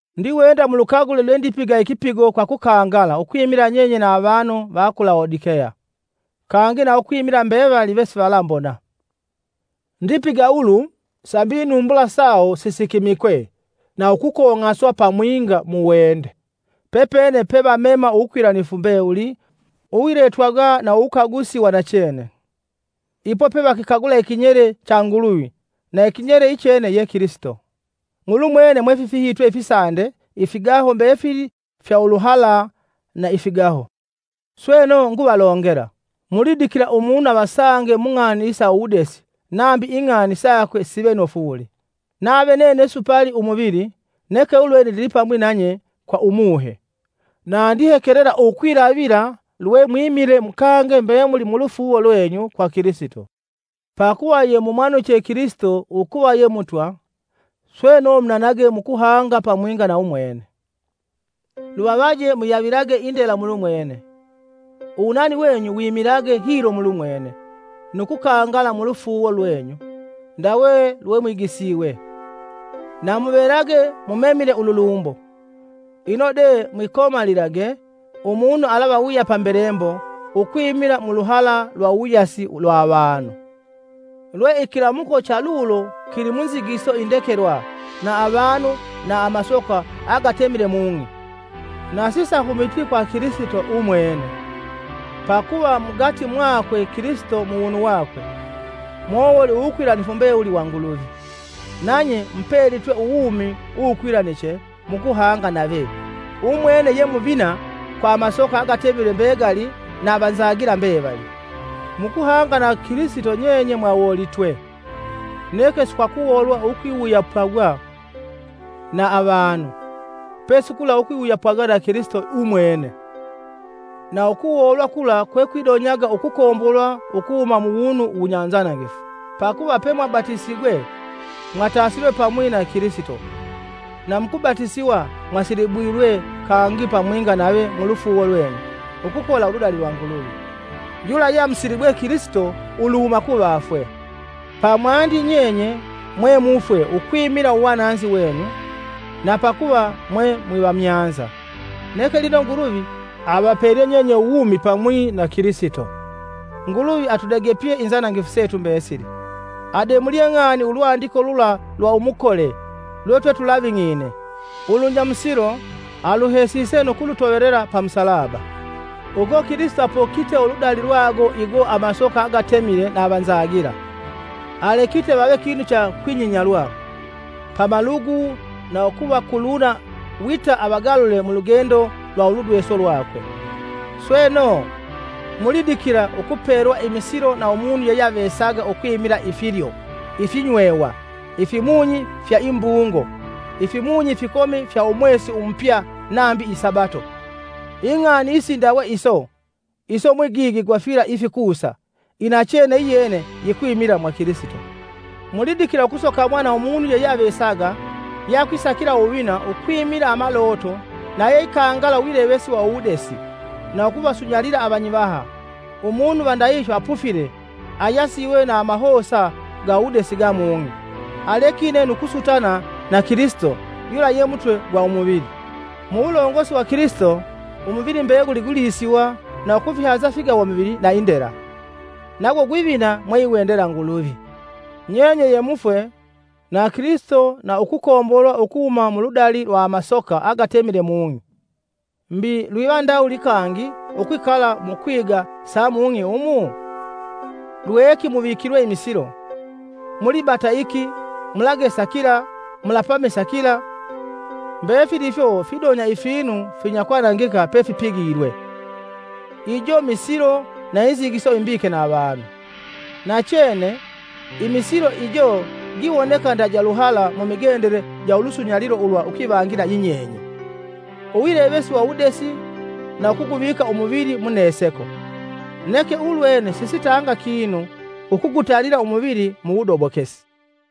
Ndiwenda mulukagule lwendipiga ikipigo kwa kukangala ukwimila nyenye na avanu va ku Lawodikeya kangi na ukwimila mbevali vesivalambona. Ndipiga ulu sambi inumbula sawo sisikimikwe na ukong'aswa pamwinga muwende, pepene pe vamema uwukwilanifu mbewuli uwiletwagwa na uwukagusi wa nachene. Ipo pevakikagula ikinyele cha Nguluvi na ikinyele ichene ye Kilisito. Mulumwene mwefifihitwe ifisande ifigaho mbefili fya uluhala na ifigaho. Sweno, nguvalongela, mulidikila umunu avasange mung'ani isa uwudesi nambi ing'ani sakwe sive nofu wuli. Nave nene supali umuvili, neke ulwene ndilipamwi nanye kwa Umuhe, na ndihekelela ukwilavila lwemwimile mukange mbemuli mulufuuwo lwenyu kwa Kilisito. Pakuva yemumwanuche Kilisito ukuva ye Mutwa, sweno munanage mukuhanga pamwinga na umwene. Luvavaje muyavilage indela mulumwene, uwunani wenyu wimilage hilo mulumwene, nu kukangala mulufuuwo lwenyu, ndawe lwemwigisiwe. Na muvelage mumemile ululumbo. Ino de mwikomalilage umunu alavawuyapa mbelembo ukwimila ukwimila muluhala lwa uwuyasi lwa avanu, lwe ikilamuko chalulo kili munzigiso indekelwa na avanu na amasoka agatemile mung'i, na sisahumiti kwa Kilisito Umwene! Pakuva, mugati mwakwe Kilisito muwunu wakwe, mowoli uwukwilanifu mbewuli wa Nguluvi, nanye mupelitwe uwumi uwukwilaniche mukuhanga nave. Umwene ye muvina kwa amasoka agatemile mbegali na avanzagila mbevali. Mukuhanga na Kilisito nyenye mwawolitwe, neke si kwa ukuwolwa ukwiwuyapagwa na avanu, pesi kula ukwiwuyapagwa na Kilisito umwene, na ukuwolwa kula kwekwidonyaga ukukombolwa ukuhuma muwunu wunyanzanangifu. Pakuva, pemwabatisigwe, mwatasilwe pamwi na Kilisito, na mukubatisiwa mwasilibulwe kangi pamwinga nave mulufuuwo lwenyu ukukola uludali lwa Nguluvi, yula yeamusilibwe Kilisito uluhuma kuvafwe. Pamwandi nyenye, mwemufwe ukwimila uwananzi wenyu na pakuva mwe mwivamyanza. Neke lino Nguluvi avapelye nyenye uwumi pamwi na Kilisito. Nguluvi atudegepye inzanangifu setu mbesili, ademulye ng'ani ulwandiko lula lwa umukole lwetwetulaving'ine ulunyamusilo aluhesise nu kulutovelela pa musalaba. Uko Kilisito apokite uludali lwago igo amasoka agatemile na avanzagila; alekite vave kinu cha kwinyinyalwa pamalugu na ukuvakuluna wita avagalule mulugendo lwa uludweso lwakwe. Sweno, mulidikila ukupelwa imisilo na umunu yeyeavesaga ukwimila ifilyo, ifinywewa, ifimunyi fya imbuungo, ifimunyi ifikomi fya umwesi umupya nambi isabato. Ing'ani isindawe iso, iso mwigigi gwa fila ifikusa, inachene iyene yikwimila mwa Kilisito. Mulidikila ukusokamwa na umunu yeyeavesaga yeakwisakila uwuvina ukwimila amaloto na yeikangala uwilevesi wa uwudesi na ukuvasunyalila avanyivaha, umunu va ndahihyo apufile ayasiwe na amahosa ga uwudesi ga mung'i alekine nu kusutana na Kilisito yula ye mutwe gwa umuvili. Muwulongosi wa Kilisito, umuvili mbeguli gwilisiwa na ukufihanza ifigawamuvili na indela, nago gwivina mweiwendela Nguluvi. Nyenye ye mufwe na Kilisito na ukukombolwa ukuhuma muludali lwa amasoka agatemile mung'i. Mbi lwiva ndawuli kangi ukwikala mukwiga sa mung'i umu? Lweki muvikilwe imisilo: “Mulibata iki,” “Mulagesa kila,” “Mulapamisa kila!” ( Mbefili ifyo fidonya ifinu finyakwanangika pefipigilwe); ijo misilo na inzigiso imbike na avanu. Nachene, imisilo ijo giwoneka nda ja luhala mumigendele ja ulusunyalilo ulwa ukwivangila yinyenye, uwilevesi wa uwudesi na ukuguvika umuvili muneseko, neke ulwene sisitanga kinu ukugutanila umuvili mu wudobokesi.